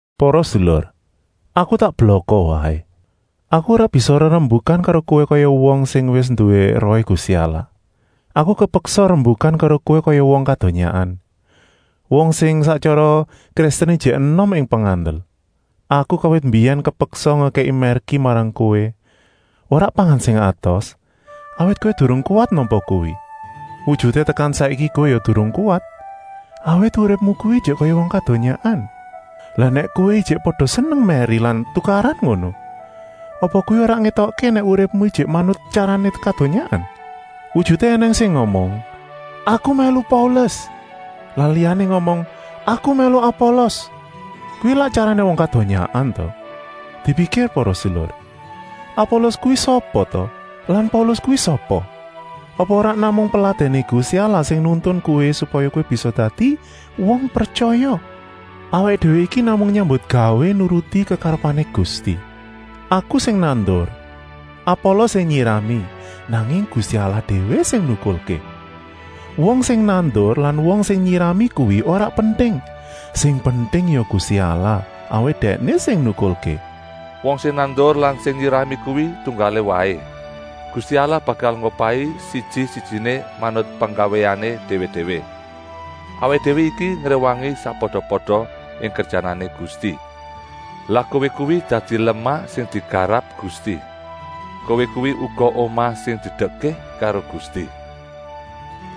Para sedulur, aku tak blaka waé! Aku ora bisa rerembukan karo kowé kaya wong sing wis nduwé Rohé Gusti Allah. Aku kepeksa rembukan karo kowé kaya wong kadonyaan, wong sing sak tyara Kristen ijik enom ing pengandel. Aku kawit mbiyèn kepeksa ngekèki mèrki marang kowé, ora pangan sing atos, awit kowé durung kuwat nampa kuwi. Wujuté tekan saiki kowé ya durung kuwat, awit uripmu kuwi ijik kaya wong kadonyaan. Lah nèk kowé ijik pada seneng mèri lan tukaran ngono, apa kuwi ora ngétokké nèk uripmu ijik manut tyarané kadonyaan? Wujuté ènèng sing ngomong: “Aku mèlu Paulus” lan liyané ngomong: “Aku mèlu Apolos.” Kuwi lak tyarané wong kadonyaan ta? Dipikir para sedulur! Apolos kuwi sapa ta lan Paulus kuwi sapa? Apa ora namung peladèné Gusti Allah sing nuntun kowé supaya bisa dadi wong pretyaya? Awaké déwé iki namung nyambutgawé nuruti kekarepané Gusti. Aku sing nandur, Apolos sing nyirami, nanging Gusti Allah déwé sing nukulké. Wong sing nandur lan wong sing nyirami kuwi ora penting. Sing penting ya Gusti Allah, awit Dèkné sing nukulké. Wong sing nandur lan sing nyirami kuwi tunggalé waé. Gusti Allah bakal ngupahi siji-sijiné manut penggawéané déwé-déwé. Awaké déwé iki ngréwangi sakpada-pada ing kerjanané Gusti. Lah kowé kuwi dadi lemah sing digarap Gusti. Kowé kuwi uga omah sing didekké karo Gusti.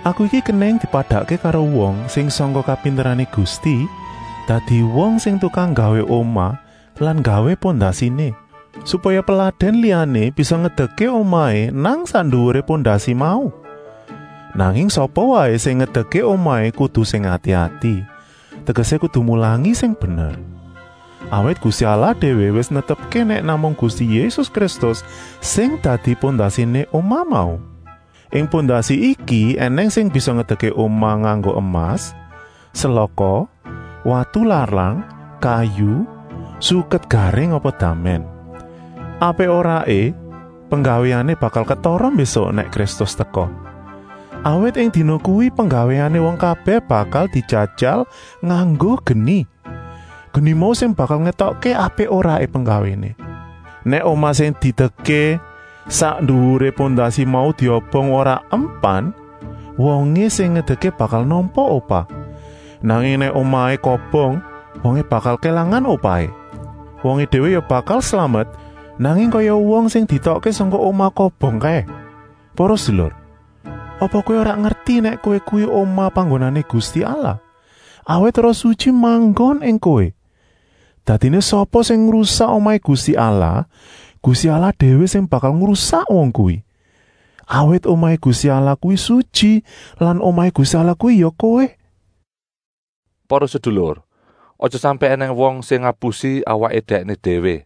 Aku iki kenèng dipadakké karo wong sing sangka kapinterané Gusti dadi wong sing tukang nggawé omah lan nggawé pondasiné, supaya peladèn liyané bisa ngedekké omahé nang sak nduwuré pondasi mau. Nanging sapa waé sing ngedekké omahé kudu sing ati-ati, tegesé kudu mulangi sing bener. Awit Gusti Allah déwé wis netepké nèk namung Gusti Yésus Kristus sing dadi pondasiné omah mau. Ing pondasi iki ènèng sing bisa ngedekké omah nganggo emas, selaka, watu larang, kayu, suket garing apa damèn. Apik-oraé penggawéané bakal ketara mbésuk nèk Kristus teka. Awit ing dina kuwi penggawéané wong kabèh bakal dijajal nganggo geni. Geni mau sing bakal ngétokké apik-oraé penggawéané. Nèk omah sing didekké sak nduwuré pondasi mau diobong ora empan, wongé sing ngedekké bakal nampa upah. Nanging nèk omahé kobong, wongé bakal kélangan upahé. Wongé déwé ya bakal slamet, nanging kaya wong sing dietokké sangka omah kobong kaé. Para sedulur, apa kowé ora ngerti nèk kowé kuwi omah panggonané Gusti Allah, awit Roh Sutyi manggon ing kowé? Dadiné sapa sing ngrusak omahé Gusti Allah, Gusti Allah déwé sing bakal ngrusak wong kuwi. Awit omahé Gusti Allah kuwi sutyi lan omahé Gusti Allah kuwi ya kowé. Para sedulur, aja sampèk ènèng wong sing ngapusi awaké dèkné déwé.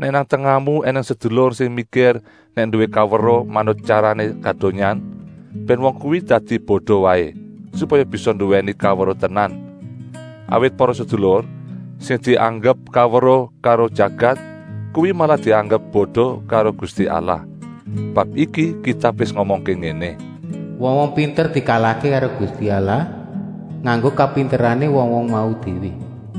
Nèk nang tengahmu ènèng sedulur sing mikir nèk nduwé kaweruh manut tyarané kadonyaan, bèn wong kuwi dadi bodo waé, supaya bisa nduwèni kaweruh tenan. Awit para sedulur, sing dianggep kaweruh karo jagat, kuwi malah dianggep bodo karo Gusti Allah. Bab iki Kitab wis ngomongké ngéné: “Wong-wong pinter dikala karo Gusti Allah nganggo kapinterané wong-wong mau déwé.”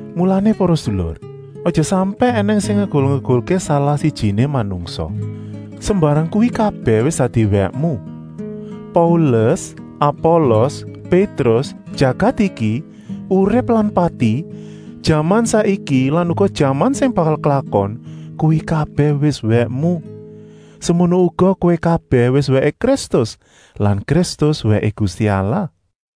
Mulané para sedulur, aja sampèk ènèng sing ngegul-egulké salah-sijiné manungsa. Sembarang kuwi kabèh wis dadi wèkmu. Paulus, Apolos, Pétrus, jagat iki, urip lan pati, jaman saiki lan uga jaman sing bakal klakon, kuwi kabèh wis wèkmu. Semono uga kowé kabèh wis wèké Kristus lan Kristus wèké Gusti Allah.